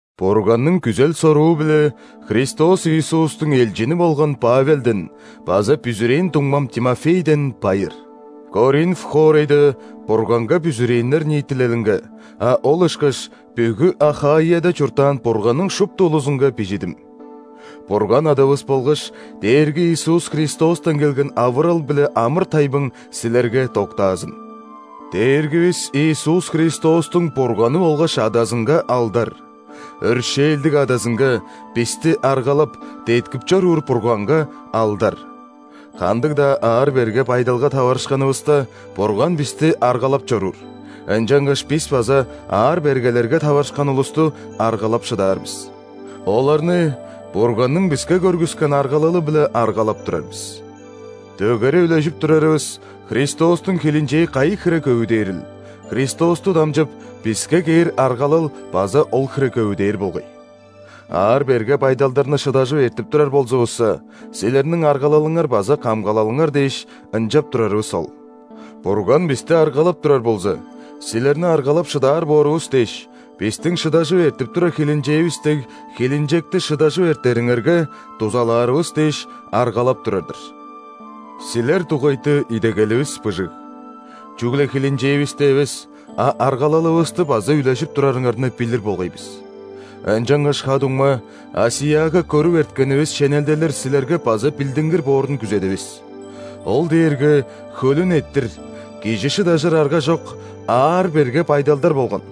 Бурганның күзел-соруу-биле Христос Иисустуң элчини болган Павелден база бүзүрээн дуңмам Тимофейден байыр. Коринф хоорайда Бурганга бүзүрээннер ниитилелинге, а ол ышкаш бүгү Ахаияда чурттаан Бурганның шупту улузунга бижидим. Бурган Адавыс болгаш Дээрги Иисус Христостан келген авырал биле амыр-тайбың силерге доктаазын! Дээргивис Иисус Христостуң Бурганы болгаш Адазынга алдар!. Өршээлдиг Адазынга, бисти аргалап, деткип чоруур Бурганга алдар! Кандыг-даа аар-берге байдалга таварышканывыста, Бурган бисти аргалап чоруур, ынчангаш бис база аар-бергелерге таварышкан улусту аргалап шыдаар бис. Оларны Бурганның биске көргүскен аргалалы-биле аргалап турар бис. Дөгере үлежип турарывыс Христостуң хилинчээ кайы хире көвүдээрил, Христосту дамчып, биске кээр аргалал база ол хире көвүдээр болгай. Аар-берге байдалдарны шыдажып эртип турар болзувусса, силерниң аргалалыңар база камгалалыңар дээш, ынчап турарывыс ол. Бурган бисти аргалап турар болза, силерни аргалап шыдаар боорувус дээш; бистиң шыдажып эртип турар хилинчээвис дег хилинчекти шыдажып эртериңерге дузалаарывыс дээш, аргалап турар-дыр. Силер дугайты идегеливис быжыг: чүгле хилинчээвисти эвес, а аргалалывысты база үлежип турарыңарны билир болгай бис. Ынчангаш, ха-дуңма, ·Асияга көрүп эрткенивис шенелделер силерге база билдингир боорун күзедивис. Ол дээрге хөлүн эрттир, кижи шыдажыр аргажок аар-берге байдалдар болган,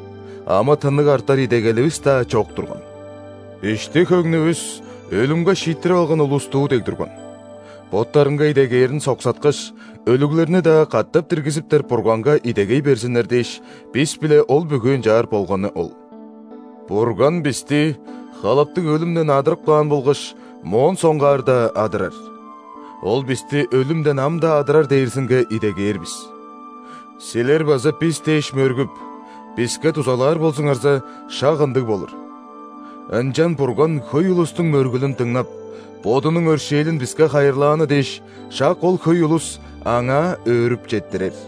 амы-тынныг артар идегеливис-даа чок турган. Ишти-хөңнүвүс өлүмге шииттирип алган улустуу дег турган. Боттарынга идегээрин соксаткаш, өлүглерни-даа катап диргизиптер Бурганга идегей берзиннер дээш, бис-биле ол бүгү ынчаар болганы ол. Бурган бисти халаптыг өлүмден адырып каан болгаш моон соңгаар-даа адырар. Ол бисти өлүмден ам-даа адырар дээрзинге идегээр бис. Силер база бис дээш мөргүп, биске дузалаар болзуңарза, шак ындыг болур. Ынчан Бурган хөй улустуң мөргүлүн дыңнап, Бодунуң өршээлин биске хайырлааны дээш, шак ол хөй улус Аңаа өөрүп четтирер.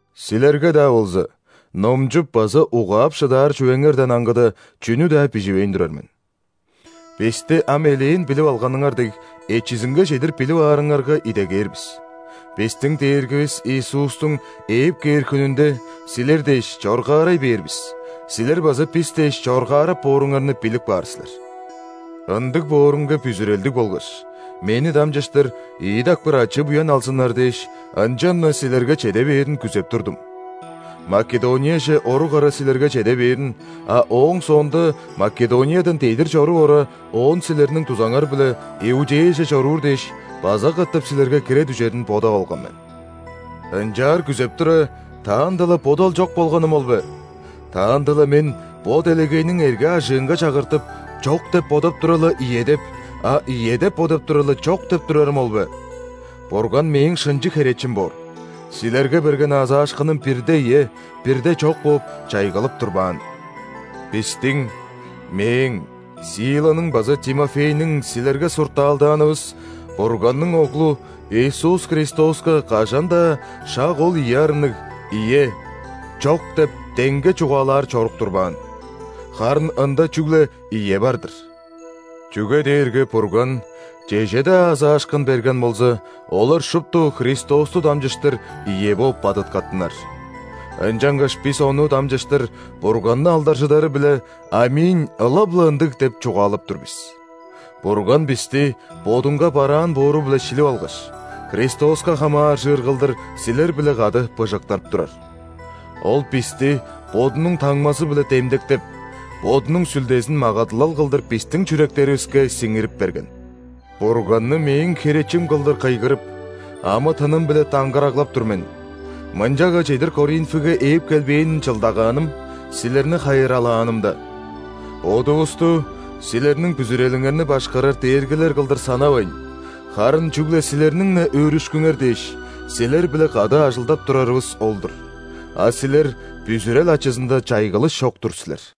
Силерге-даа болза, номчуп база угаап шыдаар чүвеңерден аңгыда, чүнү-даа биживейн турар мен. Бисти ам элээн билип алганыңар дег, эчизинге чедир билип аарыңарга идегээр бис: бистиң Дээргивис Иисустуң ээп кээр хүнүнде, силер дээш, чоргаарай бээр бис, силер база бис дээш чоргаарап бооруңарны билип каар силер. Ындыг боорунга бүзүрелдиг болгаш, мени дамчыштыр ийи дакпыр ачы-буян алзыннар дээш, ынчан-на силерге чеде бээрин күзеп турдум. Македонияже орук ара силерге чеде бээрин, а ооң соонда Македониядан дедир чоруп ора, оон силерниң дузаңар-биле Иудеяже чоруур дээш, база катап силерге кире дүжерин бодап алган мен. Ынчаар күзеп тура, таанда-ла бодал чок болганым ол бе? Таанда-ла мен бо делегейниң эрге-ажыынга чагыртып, «чок» деп бодап тура-ла, «ийе» деп, а «ийе» деп бодап тура-ла, «чок» деп турарым ол бе? Бурган мээң шынчы херечим боор: силерге берген аазаашкыным бирде «ийе», бирде «чок» бооп, чайгылып турбаан. Бистиң: мээң, Силаның база Тимофейниң силерге суртаалдаанывыс Бурганның Оглу Иисус Христоска кажан-даа шак ол ийи арынныг, «ийе», «чок» деп деңге чугаалаар чорук турбаан. Харын Ында чүгле «ийе» бар-дыр. Чүге дээрге Бурган чеже-даа аазаашкын берген болза, олар шупту Христосту дамчыштыр «ийе» бооп бадыткаттынар. Ынчангаш бис Ону дамчыштыр Бурганны алдаржыдары-биле «·Аминь – ылап-ла ындыг» деп чугаалап тур бис. Бурган бисти Бодунга бараан боору-биле шилип алгаш, Христоска хамааржыр кылдыр силер-биле кады быжыктырып турар. Ол бисти Бодунуң таңмазы-биле демдектеп, Бодунуң Сүлдезин магадылал кылдыр бистиң чүректеривиске сиңирип берген. Бурганны мээң херечим кылдыр кыйгырып, амы-тыным-биле даңгыраглап тур мен: мынчага чедир Коринфиге ээп келбээн чылдагааным – силерни хайыралаанымда. Бодувусту силерниң бүзүрелиңерни башкарар дээргилер кылдыр санавайн, харын чүгле силерниң-не өөрүшкүңер дээш, силер-биле кады ажылдап турарывыс ол-дур, а силер бүзүрел ачызында чайгылыш чок-тур силер.